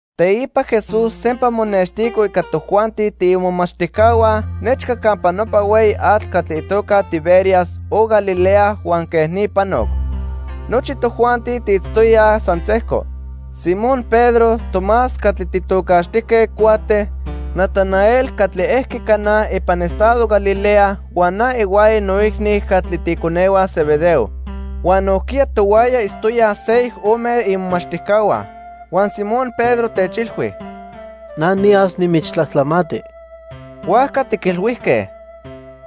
Teipa Jesús sempa monextico ica tojuanti tiimomachtijcahua nechca campa nopa hueyi atl catli itoca Tiberias o Galilea huan quej ni panoc. Nochi tojuanti tiitztoyaj san sejco: Simón Pedro, Tomás catli tijtocaxtijque Cuate, Natanael catli ejqui Caná ipan estado Galilea huan na ihuaya noicni catli tiiconehua Zebedeo. Huan nojquiya tohuaya itztoyaj seyoc ome imomachtijcahua. Huan Simón Pedro techilhui: —Na niyas nimichtlajtlamati. Huajca tiquilhuijque: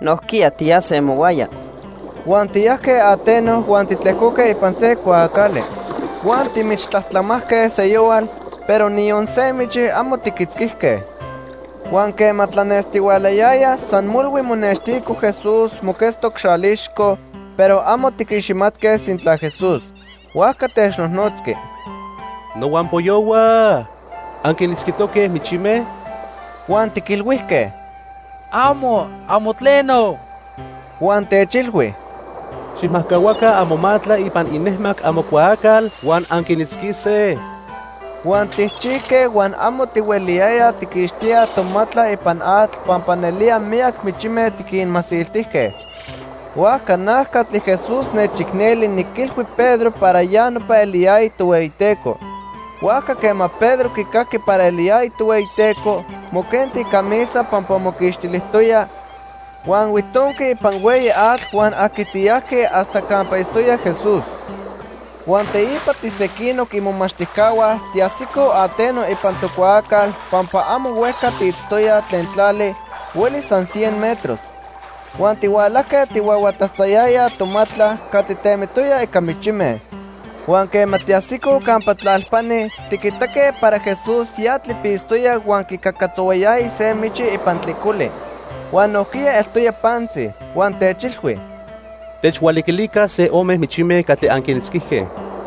—Nojquiya tiyase mohuaya. Huan tiyajque ateno huan titlejcoque ipan se cuaacali. Huan timichtlajtlamajque seyohual, pero niyon se michi amo tiquitzquijque. Huan quema tlanestihualayaya, san molhui monextico Jesús moquetztoc xalixco, pero amo tiquiximatque sintla Jesús. Huajca technojnotzqui: —Nohuampoyohua, ¿anquinitzquitoque michime? Huan tiquilhuijque: —Amo, amo tleno. Huan techilhui: —Xijmajcahuaca amomatla ipan inejmac amocuaacal huan anquinitzquise. Huan tijchijque huan amo tihueliyayaj tijquixtíaj tomatla ipan atl pampa nelía miyac michime tiquinmasiltijque. Huajca na catli Jesús nechicneli niquilhui Pedro para ya nopa eliyaya Tohueyiteco. Huajca quema Pedro quicajqui para eliyaya Tohueyiteco, moquenti icamisa pampa moquixtilijtoya, huan huitonqui ipan hueyi atl huan ajquitiyajqui hasta campa itztoya Jesús. Huan teipa tisequinoc imomachtijcahua tiajsicoj ateno ipan tocuaacal pampa amo huejca tiitztoyaj tlen tlali, huelis san cien metros. Huan tihualajque tijhuahuatatzayayaj tomatla catli temitoya ica michime. Huan quema tiajsicoj campa tlalpani, tiquitaque para Jesús ya tlipitztoya huan quicacatzohuayaya se michi ipan tlicoli. Huan nojquiya eltoya pantzi. Huan techilhui: —Techhualiquilica se ome michime catli anquinitzquijque.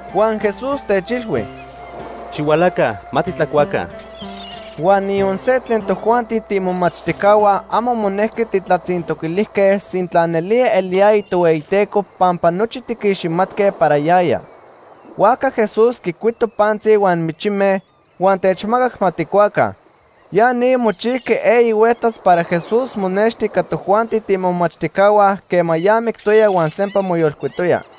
Huan Jesús techilhui: —Xihualaca, ma titlacuaca. Huan niyon se tlen tojuanti tiimomachtijcahua amo monejqui tijtlatzintoquilijque sintla nelía eliyaya Tohueyiteco pampa nochi tiquiximatque para yaya. Huajca Jesús quicuito pantzi huan michime, huan techmacac ma tijcuaca. Ya ni mochijqui eyi hueltas para Jesús monexti ica tojuanti tiimomachtijcahua quema ya mictoya huan sempa moyolcuitoya.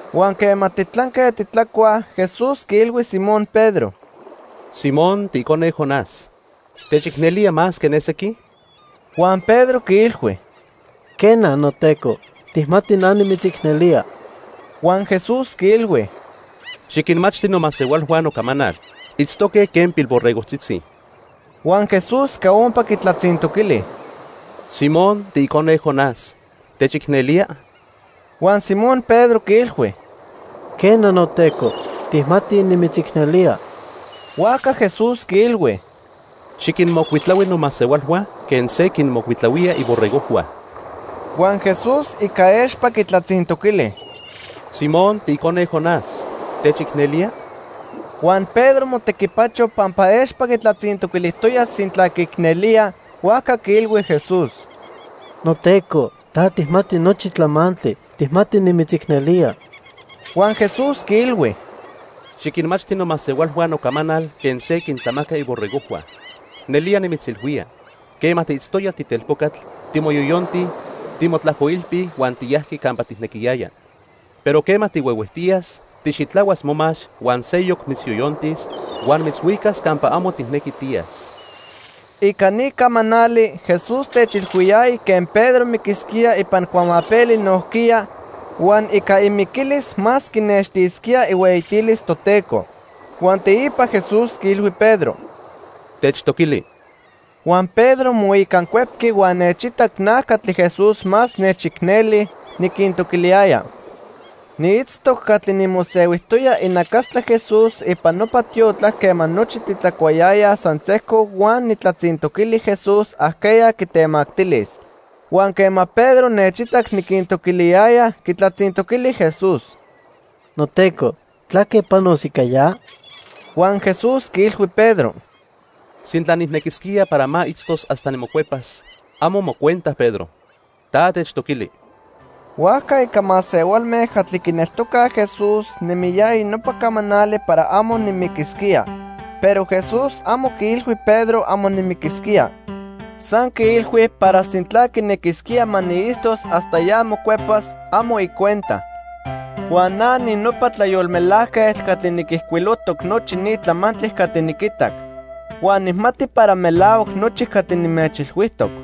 Huan quema titlanque titlacuaj, Jesús quiilhui Simón Pedro: —Simón, tiicone Jonás, ¿techicnelía más que ne sequi? Huan Pedro quiilhui: —Quena, noTeco, tijmati na nimitzicnelía. Huan Jesús quiilhui: —Xiquinmachti nomasehualhua nocamanal. Itztoque quen pilborregojtzitzi. Huan Jesús ica ompa quitlatzintoquili: —Simón, tiicone Jonás, ¿techicnelía? Huan Simón Pedro quiilhui: —Quena, noTeco, tijmati nimitzicnelía. Huajca Jesús quiilhui: —Xiquinmocuitlahui nomasehualhua quen se quinmocuitlahuía iborregojhua. Huan Jesús ica expa quitlatzintoquili: —Simón, tiicone Jonás, ¿techicnelía? Huan Pedro motequipacho pampa expa quitlatzintoquilijtoya sintla quiicnelía, huajca quiilhui Jesús: —NoTeco, ta tijmati nochi tlamantli. Tijmati nimitzicnelía. Huan Jesús quiilhui: —Xiquinmachti nomasehualhua nocamanal quen se quintlamaca iborregojhua. Nelía nimitzilhuía, quema tiitztoya titelpocatl, timoyoyonti, timotlajcoilpi huan tiyajqui campa tijnequiyaya, pero quema tihuehuejtiyas, tijxitlahuas momax huan seyoc mitzyoyontis huan mitzhuicas campa amo tijnequi tiyas. Ica ni camanali, Jesús techilhuiyaya quen Pedro miquisquía ipan cuamapeli nojquiya, huan ica imiquilis más quinextisquía ihueyitilis Toteco. Huan teipa Jesús quiilhui Pedro: —¡Techtoquili! Huan Pedro moicancuepqui huan nechitac na catli Jesús más nechicneli niquintoquiliyaya. Niitztoc catli nimosehuijtoya inacastla Jesús ipan nopa tiotlac quema nochi titlacuayayaj san sejco huan nijtlatzintoquili Jesús ajqueya quitemactilis. Huan quema Pedro nechitac niquintoquiliyaya, quitlatzintoquili Jesús: —NoTeco, ¿tlaque panos ica ya? Huan Jesús quiilhui Pedro: —Sintla nijnequisquía para ma itztos hasta nimocuepas, amo mocuenta Pedro. Ta techtoquili. Huajca ica masehualme catli quineltocaj Jesús nemiyaya nopa camanali para amo nimiquisquía. Pero Jesús amo quiilhui Pedro amo nimiquisquía. San quiilhui para sintla quinequisquía ma niitztos hasta ya mocuepas, amo icuenta. Huan na ninopa tlayolmelajquetl catli niquijcuilojtoc nochi ni tlamantli catli niquitac. Huan nijmati para melahuac nochi catli nimechilhuijtoc.